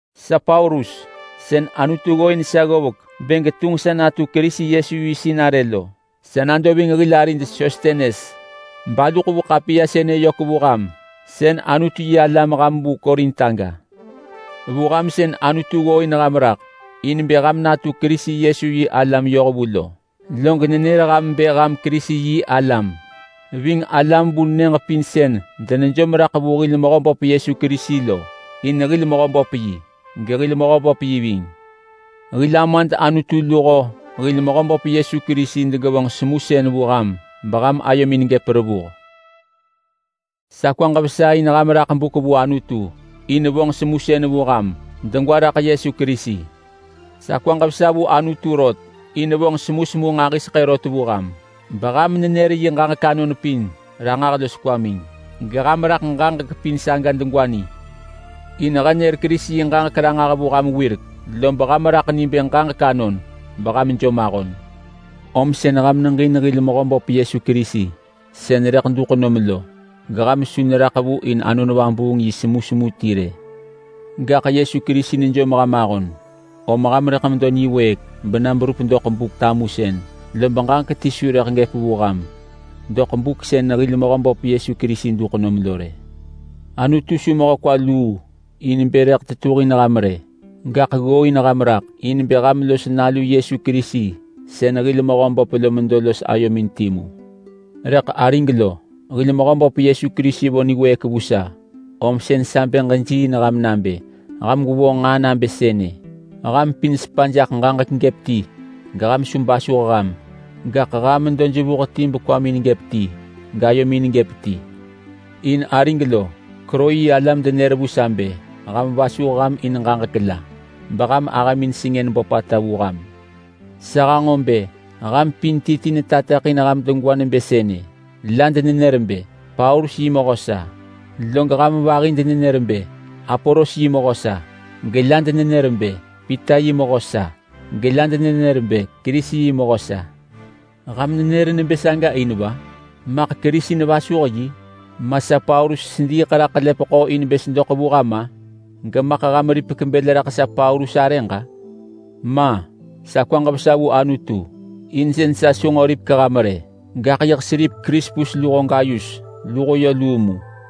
Sa Paulus sën Anutu tato sa ggovek bë getunġ sa natu Yesu Kerisi yi sinarë lo. Sa nado ving hil arid Sostenes, balu ḳevu ḳapiya sënë yök vu ham sën Anutu-yi-alam ham vu Korint aga. Vu ham sën Anutu ggooin ham raḳ in bë ham natu Kerisi Yesu yi alam yohvu lo. Log nenër ham bë ham Kerisi-yi-alam ving alam vu nyëġ pin sën denejom raḳ vu hil Mehöböp Yesu Kerisi lo. In hir Mehöböp yi, gehil Mehöböp yi ving. Hil Amad Anutu luho hil Mehöböp Yesu Kerisi degevonġ semusën vu ham beham ayomin gëp revuh. Sa kwaġ vesa in ham raḳ buk vu Anutu in vonġ semusën vu ham degwa raḳ Yesu Kerisi. Sa kwaġ vesa vu Anutu rot in vonġ semusemu nġahiseḳë rot vu ham, beham nenër yi ġaġek anon pin ranġah los kwamin, geham raḳ ġaġek pin saga degwa ni. In he nër Kerisi yi ġaġek ranġah vu ham wirek, lob ham raḳ ni bë ġaġek anon beham jom ahon. Om sën ham neġin hil Mehöböp Yesu Kerisi sën rëḳ duḳ nom lo, geham su neraḳ vu in Anon Vabuung yi semusemu ti rë. Gaḳ Yesu Kerisi nejom ham ahon, om ham rëḳ medo niwëëk bena berup doḳ Buk-tamusën, lob ġaġek ti su rëḳ gëp vu ham doḳ buk sën hil Mehöböp Yesu Kerisi duḳ nom lo rë. Anutu su mehö kwa luu in bë rëḳ tetuhin ham rë, gaḳ ggooin ham raḳ in bë ham los Nalu Yesu Kerisi sën hil Mehöböp lo medo los ayomin timu. Rëḳ arig lo, hil Mehöböp Yesu Kerisi vo niwëëk vu sa, om sën sa bë ġejiiin ham nabë ham gwevonġ nġaa nabë sënë: Ham pin gwevonġ ġaġek gëp ti, geham su basuh ham. Gaḳ ham medo jevuh ti los kwamin gëp ti, gayomin gëp ti. In arig lo, Kloe yi alam denër vu sa bë ham vasuh ham in ġaġek la, beham ahëmin sengën böpata vu ham. Sa hanġo bë ham pin ti ti netateḳin ham degwa nebë sënë: La denenër bë, “Paulus yi mehö sa!” Log ham vahi denenër bë, “Apolos yi mehö sa!” Gela denenër bë, “Pita yi mehö sa!” gela denenër bë, “Kerisi yi mehö sa!” Ham nenër nebë saga in va? Maḳ Kerisi nevasuh yi? Ma sa Paulus sediiḳ raḳ ḳelepeḳo in bë sedoḳ vu ham-a? Gemaḳ ham ripek bël raḳ sa Paulus arëġ-a? Ma! Sa kwaġ vesa vu Anutu in sën sa su nġo ripek ham rë, gaḳ yiḳ seripek Krispus luho Gayus luho luu mu.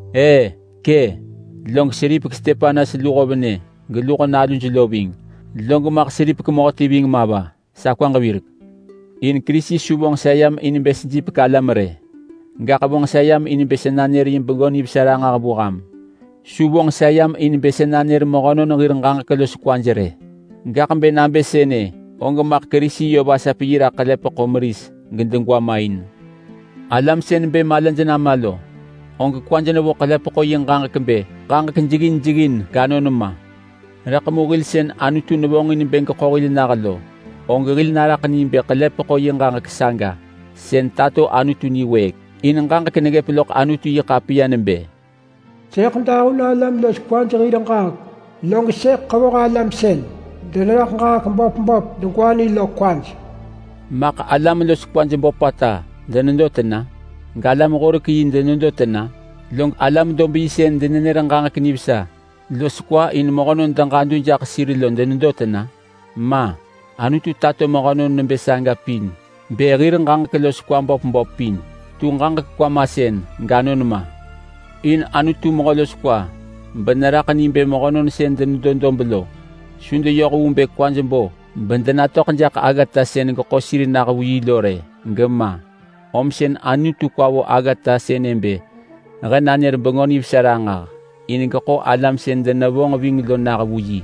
E, kë, log seripek Stepanas losho venë lo nalu lo ving. Log maḳ seripek mehöti ving ma va, sa kwaġ virek. In Kerisi su vonġ sa yam in bë sejipek alam rë! Gaḳ vonġ sa yam in bë sa nanër yi Bengö Nivesa ranġah vu ham. Su vonġ sa yam in bë sa nanër mehönon hir ġaġek los kwaj rë, gaḳ bë nabë sënë, og maḳ Kerisi yö vasap yi raḳ ḳelepeḳo meris gedegwa main. Alam sën bë malaj nama lo, og kwaj nevo ḳelepeḳo yi ġaġek bë ġaġek jeggin jeggin ganon ma. Rëḳ mu hil sën Anutu nevonġin bë geḳo hil nah lo, og hil naraḳ ni bë ḳelepeḳo yi ġaġek saga sën tato Anutu yi niwëëk. In ġaġek neggëp loḳ Anutu-yi-ḳapiya nebë: “Sëḳ dahun alam los kwaj hir ġaġek, log sëḳ ḳevoh alam sën deneraḳ ġaġek böp böp degwa ni lo kwaj.” Maḳ alam los kwaj böpata denedo tena? Galam-horek-yi denedo tena? Log alam-dob-yi sën denenër ġaġek nivesa los kwa in mehönon deġadu jaḳ sir lo denedo tena? Ma! Anutu tato mehönon nebë saga pin bë hir ġaġek los kwa böp böp pin tu ġaġek kwa masën ganon ma. In Anutu mehö los kwa beneraḳ ni bë mehönon sën denedo dob lo su deyoh vu bë kwaj bo bedenatöḳ jaḳ aggata sën geḳo sir nah vu yi lo rë gema. Om sën Anutu kwa vo aggata sënë bë he nanër Bengö Nivesa ranġah in geḳo alam sën denevonġ ving lo nah vu yi,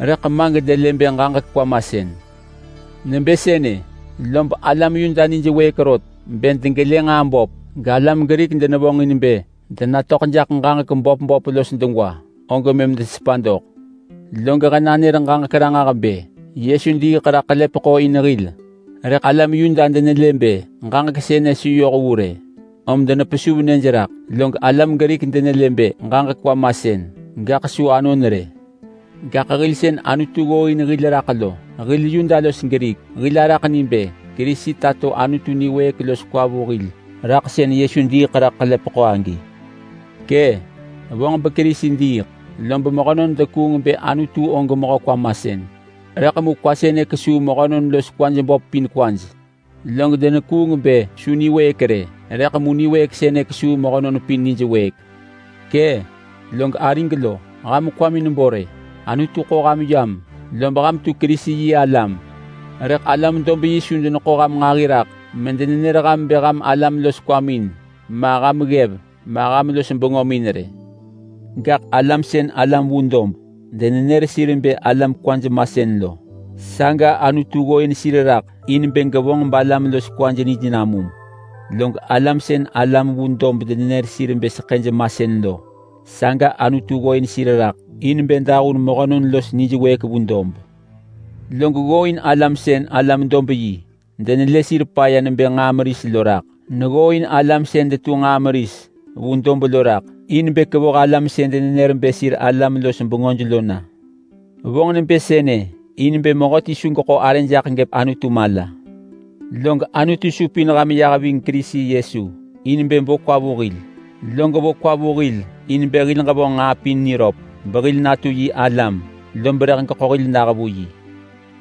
rëḳ ma gedelë bë ġaġek kwa masën. Nebë sënë, lob alam Yuda nij wëëk rot bë degelë nġaa böp, galam Grik denevonġin bë denatöḳ jaḳ ġaġek böp böp los degwa, og mëm desepa doḳ. Log he nanër ġaġek ranġah bë Yesu diiḳ raḳ ḳelepeḳo in hil, rëḳ alam Yuda denelë bë ġaġek sënë su yoh vu rë om denepesuv nyëj raḳ, log alam Grik denelë bë ġaġek kwa masën gaḳ su anon rë. Gaḳ hil sën Anutu ggooin hil raḳ lo, hil Yuda los Grik, hil araḳ ni bë Kerisi tato Anutu niwëëk los kwa vu hil raḳ sën Yesu diiḳ raḳ ḳelepeḳo agi. Kë! Vonġ beKerisi diiḳ lob mehönon denekuung bë Anutu og mehö kwa masën, rëḳ mu kwa sënë kesuu mehönon los kwaj böp pin kwaj. Log denekuung bë su niwëëk rë, rëḳ mu niwëëk sënë kesuu mehönon pin nijwëëk. Kë! Log arig lo, ham kwamin bo rë. Anutu ḳo ham yam lob ham tu Kerisi-yi-alam, rëḳ alam-dob-yi su deneḳo ham nġahi raḳ medenenër ham bë ham alam los kwamin ma, ham ggev ma, ham los bengömin rë. Gaḳ alam sën alam vu dob denenër bë alam kwaj masën lo, saga Anutu ggooin raḳ in bë gevonġ balam los kwaj nij namum. Log alam sën alam vu dob denenër sir bë seḳëj masën lo, saga Anutu ggooin sir raḳ in bë dahun mehönon los nijwëëk vu dob. Log ggooin alam sën alam-dob-yi denelë sir paya nebë nġaa meris lo raḳ. Neggooin alam sën detu nġaa meris vu dob lo raḳ in bë kevoh alam sën denenër bë sir alam-los-bengöj lo na. Vonġ nebë sënë in bë mehöti su geḳo arë jaḳ gëp Anutu mala. Log Anutu supin ham yah ving Kerisi Yesu in bë bo kwa vu hil. Log vo kwa vu hil in bë hil ġevonġ nġaa pin niröp behil natu yi alam lob rëḳ geḳo hil nah vu yi.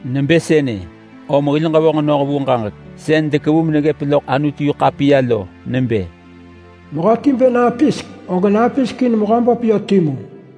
Nebë sënë, om hil ġevonġ noh vu ġaġek sën dekevu meneggëp loḳ Anutu-yi-ḳapiya lo nebë, “Mehöti bë napisek, og napisek in Mehöböp timu.”